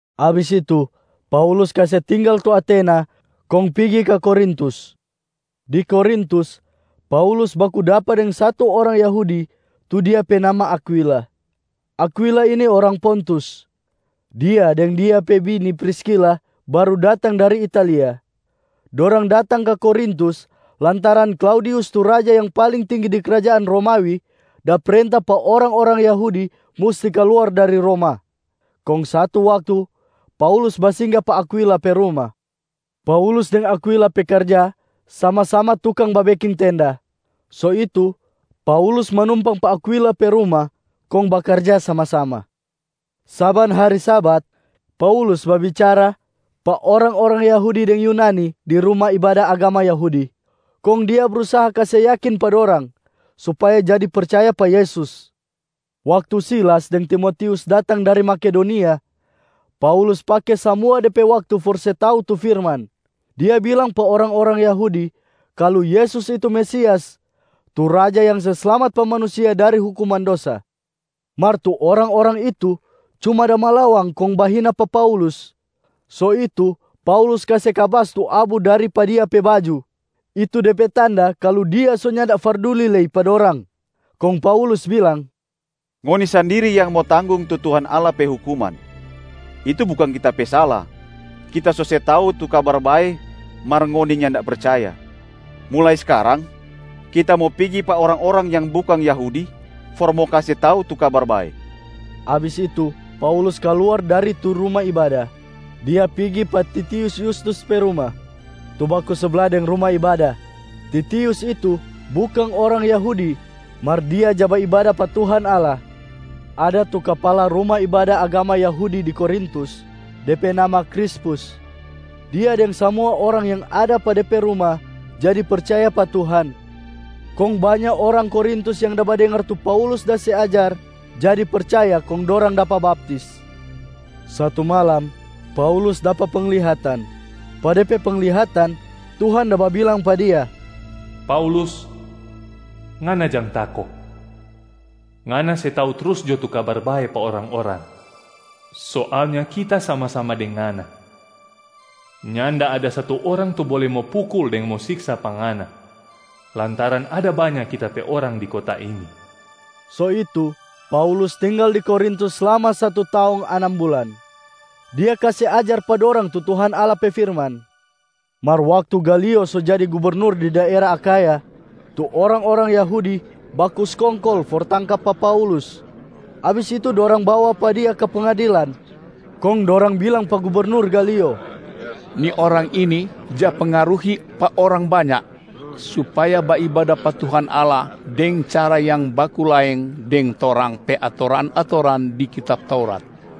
Abis itu, Paulus kase tinggal tu Atena kong pigi ka Korintus. Di Korintus, Paulus baku dapa deng satu orang Yahudi tu dia pe nama Akwila. Akwila ini orang Pontus. Dia deng dia pe bini Priskila baru datang dari Italia. Dorang datang ka Korintus lantaran Klaudius tu raja yang paling tinggi di krajaan Romawi da prenta pa orang-orang Yahudi musti kaluar dari Roma. Kong satu waktu Paulus basingga pa Akwila pe ruma. Paulus deng Akwila pe karja sama-sama tukang babeking tenda, so itu Paulus manumpang pa Akwila pe ruma kong bakarja sama-sama. Saban hari Sabat, Paulus babicara pa orang-orang Yahudi deng Yunani di ruma ibada agama Yahudi, kong dia brusaha kase yakin pa dorang supaya jadi percaya pa Yesus. Waktu Silas deng Timotius datang dari Makedonia, Paulus pake samua de pe waktu for se tau tu firman, dia bilang pa orang-orang Yahudi kalu Yesus itu Mesias tu Raja yang se slamat pa manusia dari hukuman dosa. Mar tu orang-orang itu cuma da malawang kong bahina pa Paulus. So itu Paulus kase kabas tu abu dari pa dia pe baju, itu de pe tanda kalu dia so nyanda farduli lei pa dorang. Kong Paulus bilang, “Ngoni sandiri yang mo tanggong tu Tuhan Allah pe hukuman. Itu bukang kita pe sala, kita so se tau tu Kabar Bae mar ngoni nyanda percaya. Mulai skarang, kita mo pigi pa orang-orang yang bukang Yahudi for mo kase tau tu Kabar Bae.” Abis itu, Paulus kaluar dari tu ruma ibada. Dia pigi pa Titius Yustus pe ruma, tu baku sabla deng ruma ibada. Titius itu bukang orang Yahudi mar dia ja baibada pa Tuhan Allah. Ada tu kapala ruma ibada agama Yahudi di Korintus, de pe nama Krispus. Dia deng samua orang yang ada pa de pe ruma jadi percaya pa Tuhan. Kong banya orang Korintus yang da badengar tu Paulus da se ajar jadi percaya kong dorang dapa baptis. Satu malam, Paulus dapa penglihatan. Pa de pe penglihatan, Tuhan da babilang pa dia, “Paulus, ngana jang tako. Ngana se tau trus jo tu Kabar Bae pa orang-orang. Soalnya Kita sama-sama deng ngana. Nyanda ada satu orang tu bole mo pukul deng mo siksa pa ngana, lantaran ada banya Kita pe orang di kota ini.” So itu Paulus tinggal di Korintus slama satu taong anam bulan, dia kase ajar pa dorang tu Tuhan Allah pe firman. Mar waktu Galio so jadi gubernur di daera Akhaya, tu orang-orang Yahudi baku skongkol for tangka pa Paulus. Abis itu dorang bawa pa dia ka pengadilan. Kong dorang bilang pa gubernur Galio, “Ni orang ini ja pengaruhi pa orang banya, supaya baibada pa Tuhan Allah deng cara yang baku laeng deng torang pe atoran-atoran di kitab Taurat.”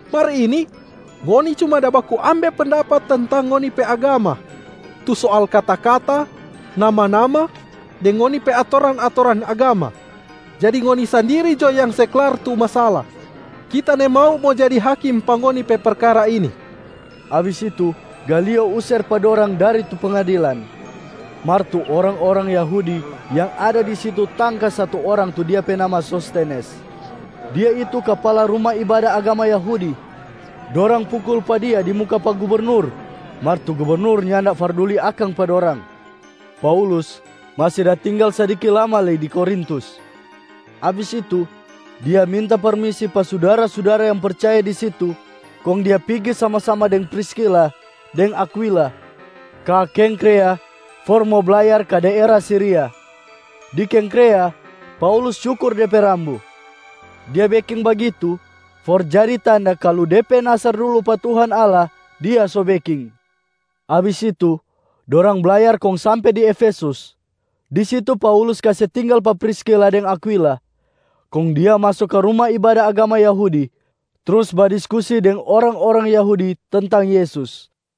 Mar ini, ngoni cuma da baku ambe pendapat tentang ngoni pe agama, tu soal kata-kata, nama-nama deng ngoni pe atoran-atoran agama. Jadi ngoni sandiri jo yang se klar tu masala, kita nimau mo jadi hakim pa ngoni pe perkara ini.” Abis itu, Galio user pa dorang dari tu pengadilan. Mar tu orang-orang Yahudi yang ada di situ tangka satu orang tu dia pe nama Sostenes. Dia itu kapala ruma ibada agama Yahudi. Dorang pukul pa dia di muka pa gubernur mar tu gubernur nyanda farduli akang pa dorang. Paulus masi da tinggal sadiki lama lei di Korintus. Abis itu, dia minta permisi pa sudara-sudara yang percaya di situ, kong dia pigi sama-sama deng Priskila deng Akwila ka Kengkrea for mo blayar ka daera Siria. Di Kengkrea, Paulus cukur de pe rambu. Dia beking bagitu for jadi tanda kalu de pe nasar dulu pa Tuhan Allah, dia so beking. Abis itu, dorang blayar kong sampe di Efesus. Di situ Paulus kase tinggal pa Priskila deng Akwila, kong dia maso ka ruma ibada agama Yahudi trus badiskusi deng orang-orang Yahudi tentang Yesus.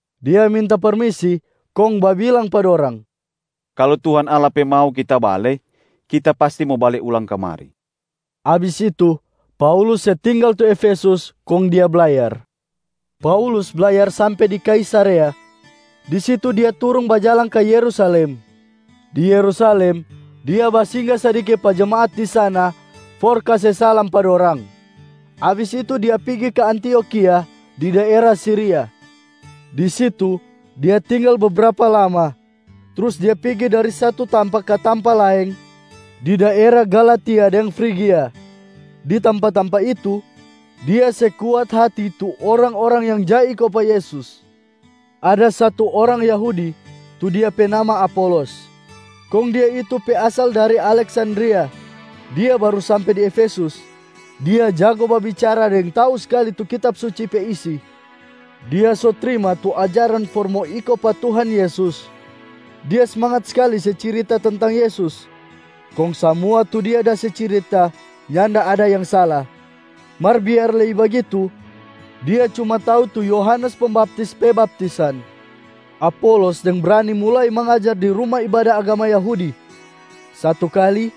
Dia minta permisi kong babilang pa dorang, “Kalu Tuhan Allah pe mau kita bale, kita pasti mo bale ulang kamari.” Abis itu, Paulus se tinggal tu Efesus kong dia blayar. Paulus blayar sampe di Kaisarea, di situ dia turung bajalang ka Yerusalem. Di Yerusalem, dia basingga sadiki pa jemaat di sana for kase salam pa dorang, abis itu dia pigi ka Antiokhia di daera Siria. Di situ dia tinggal bebrapa lama, trus dia pigi dari satu tampa ka tampa laeng di daera Galatia deng Frigia. Di tampa-tampa itu, dia se kuat hati tu orang-orang yang ja iko pa Yesus. Ada satu orang Yahudi tu dia pe nama Apolos, kong dia itu pe asal dari Aleksandria. Dia baru sampe di Efesus. Dia jago babicara deng tau skali tu Kitab Suci pe isi. Dia so trima tu ajaran for mo iko pa Tuhan Yesus. Dia smangat skali se cirita tentang Yesus, kong samua tu dia da se cirita nyanda ada yang sala. Mar biar lei bagitu, dia cuma tau tu Yohanes Pembaptis pe baptisan. Apolos deng brani mulai mangajar di ruma ibada agama Yahudi. Satu kali,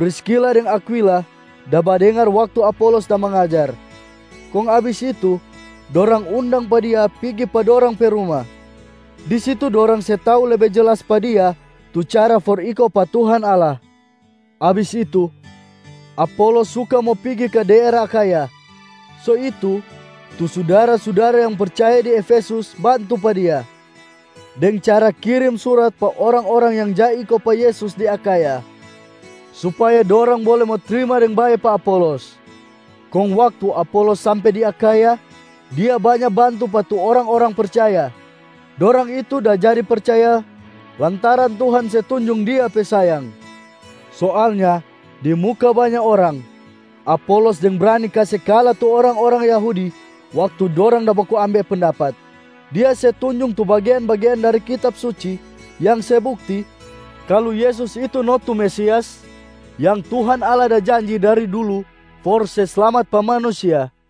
Priskila deng Akwila da badengar waktu Apolos da mangajar, kong abis itu, dorang undang pa dia pigi pa dorang pe ruma. Di situ dorang se tau lebe jelas pa dia tu cara for iko pa Tuhan Allah. Abis itu, Apolos suka mo pigi ka daera Akhaya. So itu, tu sudara-sudara yang percaya di Efesus bantu pa dia deng cara kirim surat pa orang-orang yang ja iko pa Yesus di Akhaya, supaya dorang bole mo trima deng bae pa Apolos. Kong waktu Apolos sampe di Akhaya, dia banya bantu pa tu orang-orang percaya, dorang itu da jadi percaya lantaran Tuhan se tunjung Dia pe sayang. Soalnya di muka banya orang, Apolos deng brani kase kala tu orang-orang Yahudi waktu dorang da baku ambe pendapat. Dia se tunjung tu bagean-bagean dari Kitab Suci yang se bukti kalu Yesus itu no tu Mesias yang Tuhan Allah da janji dari dulu for se slamat pa manusia.